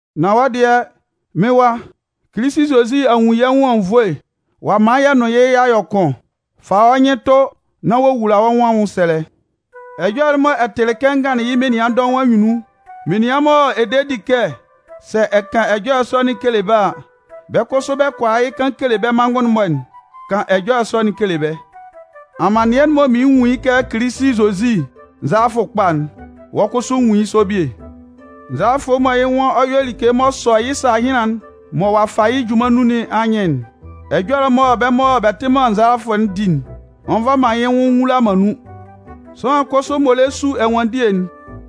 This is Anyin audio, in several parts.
Nan wɔ́ dɩɛ, mɩ́n wa, Kilisi Zozi a nwun yɛ́ nwʋn anwunnvoe ɔ'a man yɛ nʋn yɩ́ y'a yɔ kʋn. Fa wɔ́ nyɩn tʋ nán wowula wɔ́ nwʋn anwʋnsɛlɛ. Ɛjɔlɛ'n mɔ ɛ tɩlɩ kɛ n ganlɩn yɩ́ menian dɔʋn anyunnun, menian mɔ ɛ de di kɛ sɛ ɛ kan ɛjɔlɛ sɔ'n kele bɛ́ a, bɛ́ kʋsʋ bɛ kɔ hʋala yɩ́ kan kele bɛ́ manngʋn'n-mɔ'n, kan ɛjɔlɛ sɔ'n kele bɛ́. Amannɩɛ'n m'ɔ mɩɩn nwun yɩ́ kɛ Kilisi Zozi nzalafʋ kpa'n, wɔ́ kʋsʋ nwun yɩ́ sɔ bie. Nzalafʋ mɔ yɩ́ nwan ɔ yɔ like m'ɔ sɔ yɩ́ sahɩnlan'n mɔ ɔ'a fa yɩ́ junman nun nɩn anyɩn'n, ɛjɔlɛ mɔ bɛ́ mɔ bɛ tɩ man nzalafʋ'n di'n, ɔ nva man yɩ́ nwʋn nwula man nun. Sʋanlan kʋsʋ m'ɔ lɛ su ɛnwanndie'n,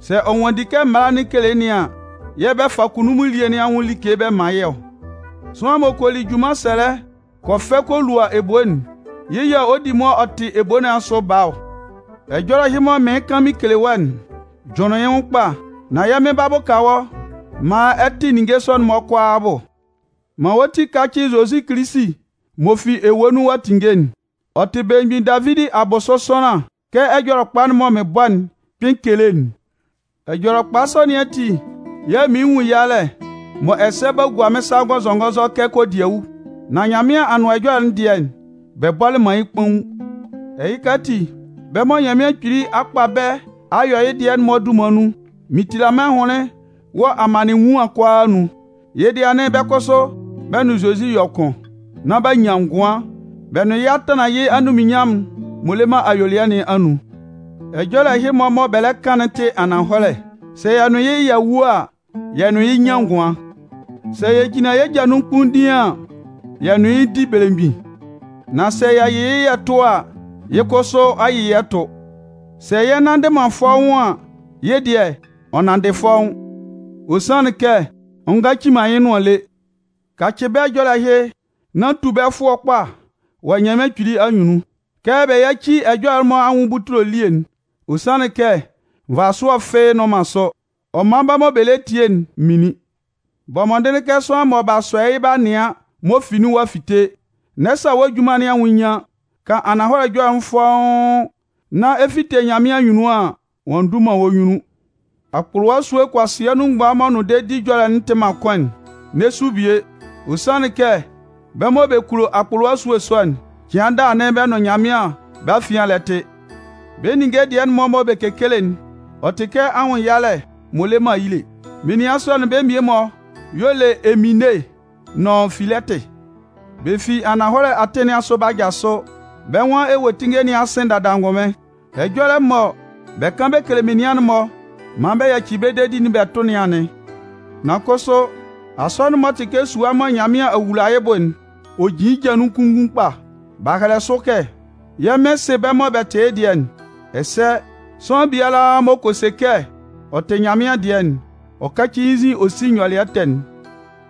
sɛ ɔ nwanndi kɛ mala'n kele nɩn an, yɛ̂ bɛ fa kunnunmun elie nɩn anwʋn like bɛ man yɩ́ ɔ. Sʋanlan m'ɔ kɔ li junman sɛlɛ kɔ fɛ kɔ lua ebo'n, yɩ́ yɛ̂ ɔ di mʋa ɔ tɩ ebo nɩn asʋ baa ɔ. Ɛjɔlɛ ɛhɩ mɔ mɩɩn kan mɩn kele wɔ́'n, jʋnlɩn yɩ́ nwʋn kpa, nán yɛ́ Mɩn 'ba bʋka wɔ́ maan ɛ tɩ ninnge sɔ'n-mɔ kʋalaa abʋ. Man wɔ́ ti kácɩ Zozi Kilisi m'ɔ fi ewue nun ɔ'a tinnge'n. Ɔ tɩ belemgbin Davidi abʋsʋ sʋanlan kɛ Ɛjɔlɛkpa'n mɔ mɩn bɔ'n kpɩn kele'n. Ɛjɔlɛkpa sɔ nɩn ati yɛ̂ mɩɩn nwun yalɛ m'ɔ ɛsɛ b'a gua mɩ́n sa ngɔnzɔngɔnzɔ kɛ kodiawu. Nan Nyanmɩan Anʋan Ɛjɔlɛ'n dɩɛ, bɛ bɔlɩ man yɩ́ kpaun. Ɛhɩka ati, bɛ́ mɔ Nyanmɩan Kpili a kpa bɛ́ a yɔ yɩ́ dɩɛ'n-mɔ dunman nun, mɩn tila mɩ́n ahʋnlɩn wɔ amannɩɛ enwuan'n kʋalaa anun. Yɩ́ dɩɛ anɩn bɛ́ kʋsʋ bɛ nʋn Zozi yɔ kʋn, nán b'a nyan ngʋan, bɛ nʋn yɩ́ a tanlan yɩ́ anunminnyanmʋn'n m'ɔ le man ayuelɩɛ nɩn anun. Ɛjɔlɛ ɛhɩ-mɔ mɔ bɛ lɛ kan'n tɩ ananhɔlɛ: Sɛ yɛ nʋn yɩ́, y'a wu a, yɛ nʋn yɩ́ 'nyan ngʋan. Sɛ yɛ jinlan yɛ́ ja nun kpunndiin an, yɛ nʋn yɩ́ 'di belemgbin. Nan sɛ yɛ yɩ yɩ́ yɛ tʋ a, yɩ́ kʋsʋ ɔ 'yɩ yɛ́ tʋ. Sɛ yɛ nnanndɩ man fɔ́ʋ́n an, yɩ́ dɩɛ, ɔ nanndɩ fɔ́ʋ́n. Ɔ sanlɩn kɛ ɔ ngaci man yɩ́ nʋan lé. Kacɩ bɛ́ ɛjɔlɛ ɛhɩ nán tu bɛ́ fʋɔ kpa wɔ Nyanmɩan Kpili anyunnun, kɛ bɛ yáci ɛjɔlɛ'n-mɔ anwʋn butule elie'n. Ɔ sanlɩn kɛ nvasʋɛ fɩ́ɩ́ nnʋn man sʋ, ɔ man bɛ́ mɔ bɛ lɛ tie'n minlin. Bɔ mɔndɩnlɩn kɛ sʋanlan mɔ b'a sɔ yɩ́ b'a nɩan m'ɔ fi nun ɔ'a fite, n'ɛ sa wɔ́ junman nɩn anwʋn nyian, kan ananhɔlɛ ɛjɔlɛ'n fɔ́ʋ́n, nán ɛ fite Nyanmɩan anyunnun an, ɔ'a ndu man wɔ́ nyunnun Akpʋlʋwa esue kʋasɩa nun mgban m'ɔ nʋn dedi ɛjɔlɛ'n tɩ man kʋn'n, n'ɛ su bie. Ɔ sanlɩn kɛ bɛ́ mɔ bɛ kulo akpʋlʋwa esue sɔ'n, cɩan daa anɩn bɛ nʋn Nyanmɩan bɛ́ afian lɛ tɩ. Bɛ́ ninnge dɩɛ'n mɔ bɛ kekele'n, ɔ tɩ kɛ anwʋnnyalɛ m'ɔ le man ayile. Menian sɔ'n bɛ́ mmie-mɔ y'ɔ le Imene nʋn Filɛtɩ. Bɛ fi ananhɔlɛ atɩn nɩn asʋ b'a jasʋ, bɛ́ nwan ewuetinnge nɩn a sɩn dada angʋnmɩn. Ɛjɔlɛ mɔ bɛ kan bɛ kele menian'n-mɔ maan bɛ yaci bɛ́ dedi'n bɛ tʋ nɩn anɩn. Nan kʋsʋ Asɔnɩn'n m'ɔ tɩ kɛ sua mɔ Nyanmɩan a wula yɩ́ bʋ'n, ɔ jin yɩ́ ja nun kunngun kpa. B'a hɛlɛ sʋ kɛ: “Yɛ́ Mɩn sɩ bɛ́ mɔ bɛ tɩ yɩ́ dɩɛ'n.” Ɛsɛ “Sʋanlan biala m'ɔ kɔ se kɛ ɔ tɩ Nyanmɩan dɩɛ'n, ɔ káci yɩ́ nzin ɔ sí nyɔlɩɛ ɛtɛ'n.”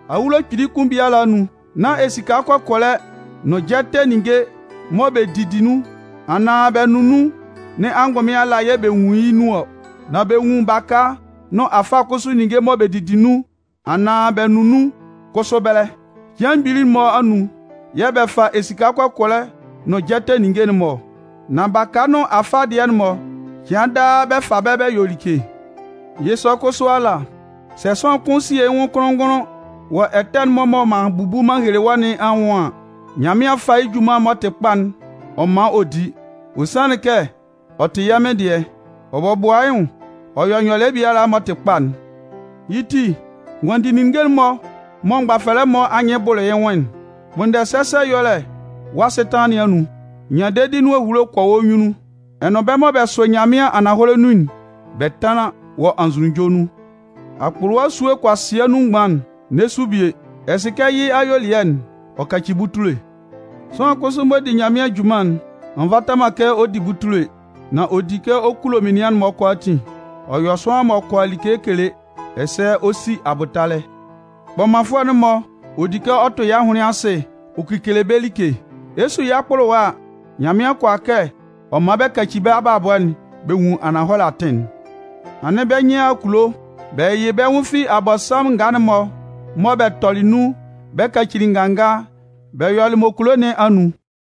Awulo kpili kʋn biala anun, nán esika kɔkɔlɛ nʋn jɛtɛ ninnge mɔ bɛ didi nun anaan bɛ nʋn nun nɩn angʋnmɩn ala yɛ bɛ nwun yɩ́ nun ɔ. Nan bɛ nwun baka nʋn afa kʋsʋ ninnge mɔ bɛ didi nun anaan bɛ nʋn nun kʋsʋ ɛbɛlɛ. Cɩan mgbili'n-mɔ anun yɛ́ bɛ fa esika kɔkɔlɛ nʋn jɛtɛ ninnge'n-mɔ ɔ. Nan baka nʋn afa dɩɛ'n-mɔ, cɩan daa bɛ fa bɛ yɔ like. Yɩ́ sɔ kʋsʋ ala, sɛ sʋanlan kʋn sie yɩ́ nwʋn kʋnlʋn-ngʋnlʋn wɔ ɛtɛ'n-mɔ mɔ m'an bubu m'an hele wɔ́ nɩn anwʋn an, Nyanmɩan 'fa junman m'ɔ tɩ kpa'n ɔ man ɔ di. Ɔ sanlɩn kɛ ɔ tɩ yɩ́ Mɩn dɩɛ. Ɔ bɔbʋa yɩ́ nwʋn ɔ yɔ nyɔlɩɛ biala m'ɔ tɩ kpa'n. Yɩ́ ti, nwanndi ninnge'n-mɔ mɔ mgbafɛlɛ'n-mɔ anyɩn bʋlʋ yɩ́ nwʋn'n. Kpʋnndɛ sɛsɛ ɛyɔlɛ wɔ́ asɩtanlan nɩn anun, nyan dedi nʋn ehulo kɔ wɔ́ nyunnun, ɛ nʋn bɛ́ mɔ bɛ sʋ Nyanmɩan ananhɔlɛ nun'n bɛ tánlan wɔ anzʋnunjɔ nun. Akpʋlʋwa esue kʋasɩa nun mgban'n, n'ɛ su bie. Ɛ sɩ kɛ yɩ́ ayuelɩɛ'n, ɔ kaci butule. Sʋanlan kʋsʋ m'ɔ di Nyanmɩan junman'n, ɔ nvata man kɛ ɔ di butule. Nan ɔ di kɛ ɔ kulo menian'n-mɔ kʋalaatin, ɔ yɔ sʋanlan m'ɔ kʋala like kele, ɛsɛ ɔ si abʋtalɛ. Kpʋlʋfʋɛ'n-mɔ, ɔ di kɛ ɔ tʋ yɩ́ ahʋnlɩn asɩ ɔ kekele bɛ́ like. Ɛ 'su yɩ́ akpʋlʋwa a, Nyanmɩan kʋala kɛ ɔ man bɛ kaci bɛ́ abalabɔ'n bɛ nwun ananhɔlɛ atɩn'n. Anɩn bɛ́ nyɩn a a kulo, bɛ yɩyɩ bɛ́ nwʋn fi Abɔnsanmʋn ngaa'n-mɔ mɔ bɛ tɔlɩ nun bɛ kacili nganga bɛ yɔlɩ m'ɔ kulo nɩn anun.